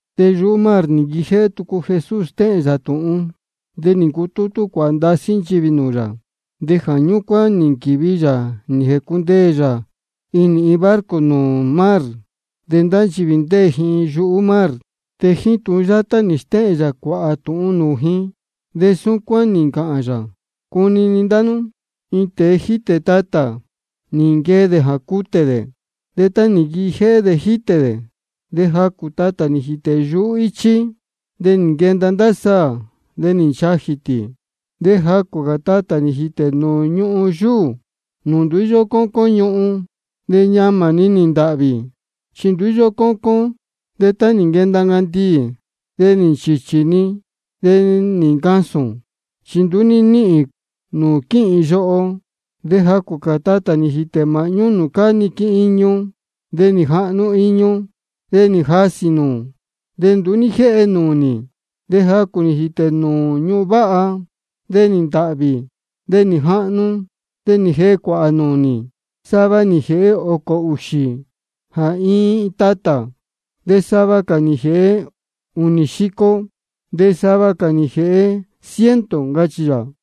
De yuhú mar nī nquijéhé tucu Jesús stéhēn yā tūhun. De nī ncutútú cuāhā ndasí nchivī nūū yā, de jā ñúcuán nī nquīvi yā nī jēcundeē yā inī iin barco nūū mar. De ndá nchivī ndéē ji yuhú mar. De jíín tūhun yátá nī stéhēn yā cuāhā tūhun nūū ji, de súcuán nī ncāhān yā: Cunini ndá nú: Iin tēe jítē tatā, nī nquee dē jā cutē dē. De tá nī nquijéhé dē jítē dē, de jacū tatā nī jītē yuhú íchí. De nī nquenda ndá saā, de nī nchajī tī. De jacū cā tatā nī jītē nūū ñuhun yúū, nūū nduú íyó cócón ñuhun. De ñamā-ni nī ntāhvī, chi nduú íyó cócón. De tá nī nquenda ncandiī, de nī nchīchī-ni, de nī ncasūn, chi nduú ní níhīn nūū quíhīn yoho. De jacū cā tatā nī jītē māhñú nūū cáá niquin iñu. De nī jahnu iñu, de nī jasī nūū, de nduú ní jéhe nūnī. De jacū nī jītē nūū ñuhun váha. De nī ntāhvī, de nī jahnu, de nī jēhe cuāhā nūnī. Sava nī jēhe ōcō ūxī jā iin iin tatā, de sava cā nī jēhe ūnī xico, de sava cā nī jēhe ciento, ncachī yā.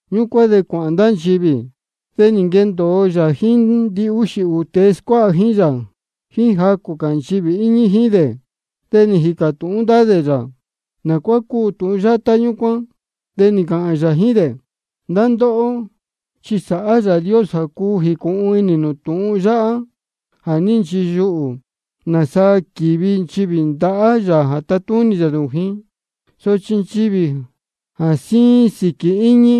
Ñúcuán de cuāhān ndá nchivī, de nī nquendōo yā jíín ndihúxī ūū tēe scuáha jíín yā, jíín jacū cā nchivī íñí jíín dē. De nī jīcā tūhún ndá dē yā nā cuá cúu tūhun yátá ñúcuán. De nī ncāhān yā jíín dē: Ndá ndóhó, chi sáhá Yāā Dios jā cuu jīcūhun inī nū tūhun yáhá jā ní nchiyuhū, nāsa quívi nchivī ndahá yā jā tatúnī yā nūū ji. Sochi nchivī jā síín sīquī íñí,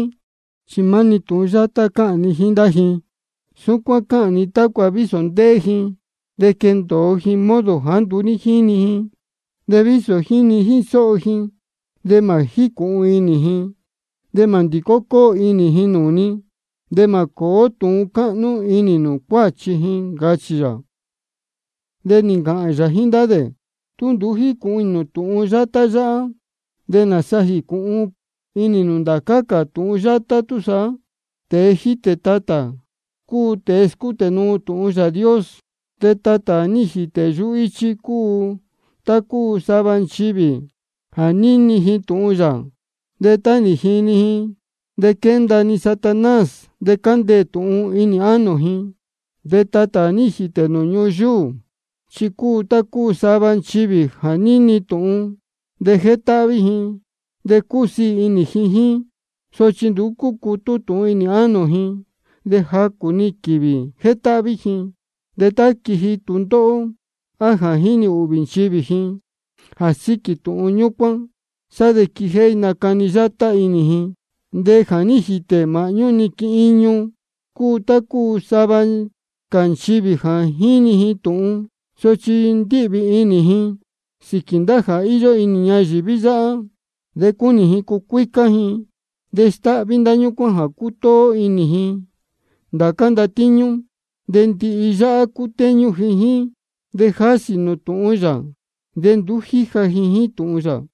chi maá-ni jíín tūhun yátá cáhān ni jíín ndá ji. Súcuán cáhān ni tácua vísō ndéhé ji, de quendōo ji modo jāá nduú jínī ji. De vísō jíni jíín sóho ji, de mā jícūhun inī ji, de mā ndīcó cóo inī ji nūū ni, de mā cōó tūhun cáhnú inī nūū cuáchi ji, ncachī yā. De nī ncāhān cā yā jíín ndá dē: Tú nduú jícūhun inī nū tūhun yátá yáhá, ¿de nāsa jīcūhun inī nū ndācá cā tūhun yátá túsaá? Tēe jítē tatā cúu tēe scútē nuu tūhun Yāā Dios. De tatā jā ní jītē yuhú íchí cúu tá cúu sava nchivī jā níni ji tūhun yā, de tá nī jini ji, de quénda-ni Satanás de cándeē tūhun inī ánō ji. De tatā jā ní jītē nūū ñuhun yúū, chi cúu tá cúu sava nchivī jā níni tūhun, de jétáhví ji de cúsiī inī ji jíín. Sochi nduú cúcutú tūhun inī ánō ji, de jacū-ni quīvī jétáhví ji. De tá quíji tūndóhó, á jā jínī ūhvī nchivī ji jā síquī tūhun ñúcuán, sá de quíjéhé nácani yátá inī ji. De jā ní jītē māhñú niquin iñu cúu tá cúu sava cā nchivī jā jíni ji tūhun, sochi ndíhvī inī ji sīquī ndá jā íyó inī ñayīví yáhá. De cúnī ji cucuícá ji, de stáhví ndá ñúcuán jā cútóó inī ji ndācá ndatíñú. De ndihi yáhá cútéñú ji jíín, de jásī nūū tūhun yā, de nduú jíja ji jíín tūhun yā.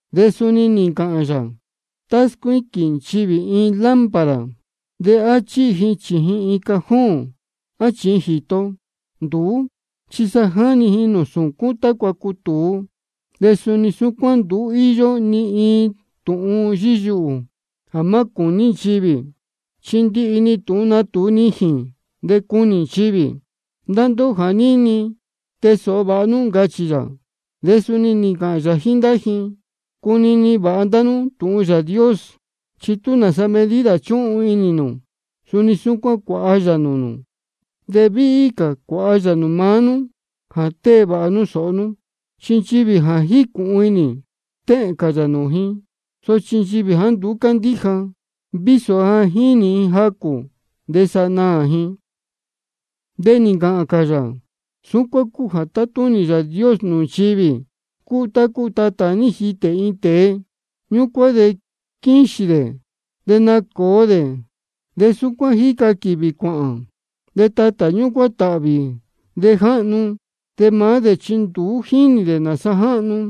De suni nī ncāhān cā yā: Tá scuíquīn nchivī iin lámpara, ¿de á chíhi ji chījin iin cajón á chījin jīto? Nduú chi jáni ji nūū sūcún tácua cutūú. De suni súcuán, nduú íyó ni iin tūhun yíyuhū jā má cūní nchivī, chi ndihi-ni tūhun natūu nijīn de cunī nchivī. Ndá ndóhó jā níni, tee sōho vāha nú, ncachī yā. De suni nī ncāhān yā jíín ndá ji: Cunini vāha ndá nú tūhun Yāā Dios. Chi tú nāsa medida chúhun inī nū, suni súcuán cuāha yā nūū nū, de víhí cā cuāha yā nūū maá nú jā tée vāha nú sōho nú. Chi nchivī ja jícūhun inī, stéhēn cā yā nūū ji. Sochi nchivī jāá nduú cándíja, vísō ja jínī ji jacū, de sa naā. De nī ncāhān cā yā: Súcuán cúu jā tátúnī Yāā Dios nūū nchivī: Cúu tá cúu tatā jā ní jitē iin tēe. Ñúcuán de quíxīn dē de nácōo dē, de súcuán jíca quīvī cuāhān. De tatā ñúcuán táhvī de jáhnu. De maá dē chi nduú jínī dē nāsa jáhnu.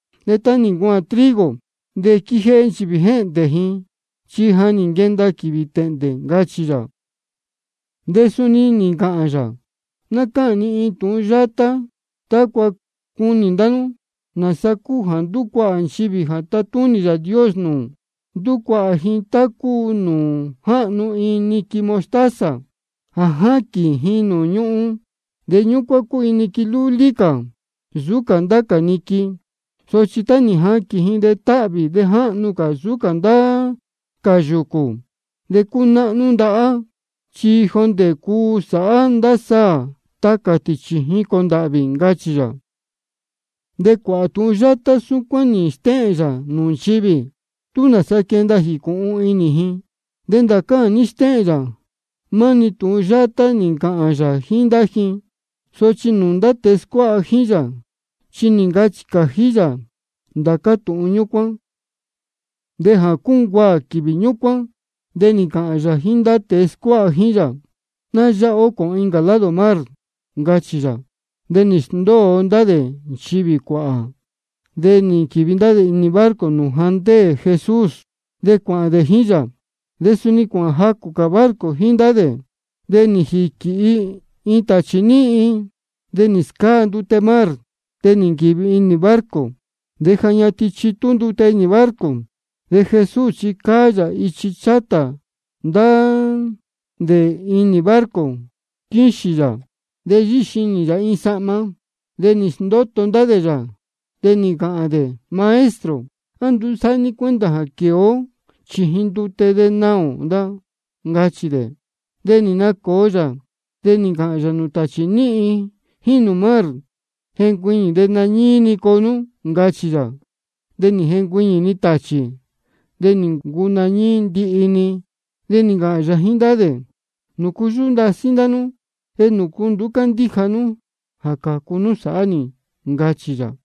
De tá nī ncuaān trigo, de quíjéhé nchivī jéhndē ji, chi ja nī nquenda quīvī tēhndē, ncachī yā. De suni nī ncāhān yā: Ná cáhān ni iin tūhun yátá tácua cunī ndá nú nāsa cúu jā ndúcuahā nchivī jā tátúnī Yāā Dios nūū. Ndúcuahā ji tá cúu nūū jáhnu iin niquin mostaza jā jáquīn ji nūū ñuhun. De ñúcuán cúu iin niquin lúlí cā nsūú cā ndá cā niquin. Sochi tá nī jaquīn ji, de táhvī de jáhnu cā nsūú cā ndá cā yūcū, de cúnáhnú ndahá, chi jondē cuu sāhá ndá saā tacā tī chījin cōndāhvī, ncachī yā. De cuāhā tūhun yátá súcuán nī stéhēn yā nūū nchivī, tú nāsa quénda ji jīcūhun inī ji. De ndācá jā ní stéhēn yā, maá-ni tūhun yátá nī ncāhān yā jíín ndá ji. Sochi nūū ndá tēe scuáha jíín yā chi nī ncachī cājí yā ndācá tūhun ñúcuán. De jā cúncuaā quīvī ñúcuán, de nī ncāhān yā jíín ndá tēe scuáha jíín yā: Ná yáha ó cōhōn incā lado mar, ncachī yā. De nī sndóo ndá dē nchivī cuāhā, de nī nquīvi ndá dē inī barco nūū ja ndéē Jesús, de cuāhān dē jíín yā. De suni cuāhān jacū cā barco jíín ndá dē. De nī jīquīhi iin tāchī níhin, de nī scáa ndute mar, de nī nquīvi inī barco. De ja ñatin chitú ndute inī barco. De Jesús chi cáá yā ichi chátā ndá dē inī barco, quíxīn yā de yíxinī yā iin sahma. De nī sndóto ndá dē yā, de nī ncāhān dē: Maestro, ¿á nduú sáhá ní cuenta jā quēe ó chījin ndute de naā ō da? ncachī dē. De nī nacōo yā, de nī ncāhān yā nūū tāchī níhin jíín nūū mar: Jencuiñī de nañíí-ni coo nú, ncachī yā. De nī jencuiñī tāchī, de nī ncuu nañíí ndihi-ni. De nī ncāhān yā jíín ndá dē: ¿Nūcu yúhú ndasí ndá nú? ¿De nūcu nduú cándíja nú jā cācu nú sāhá nī? ncachī yā.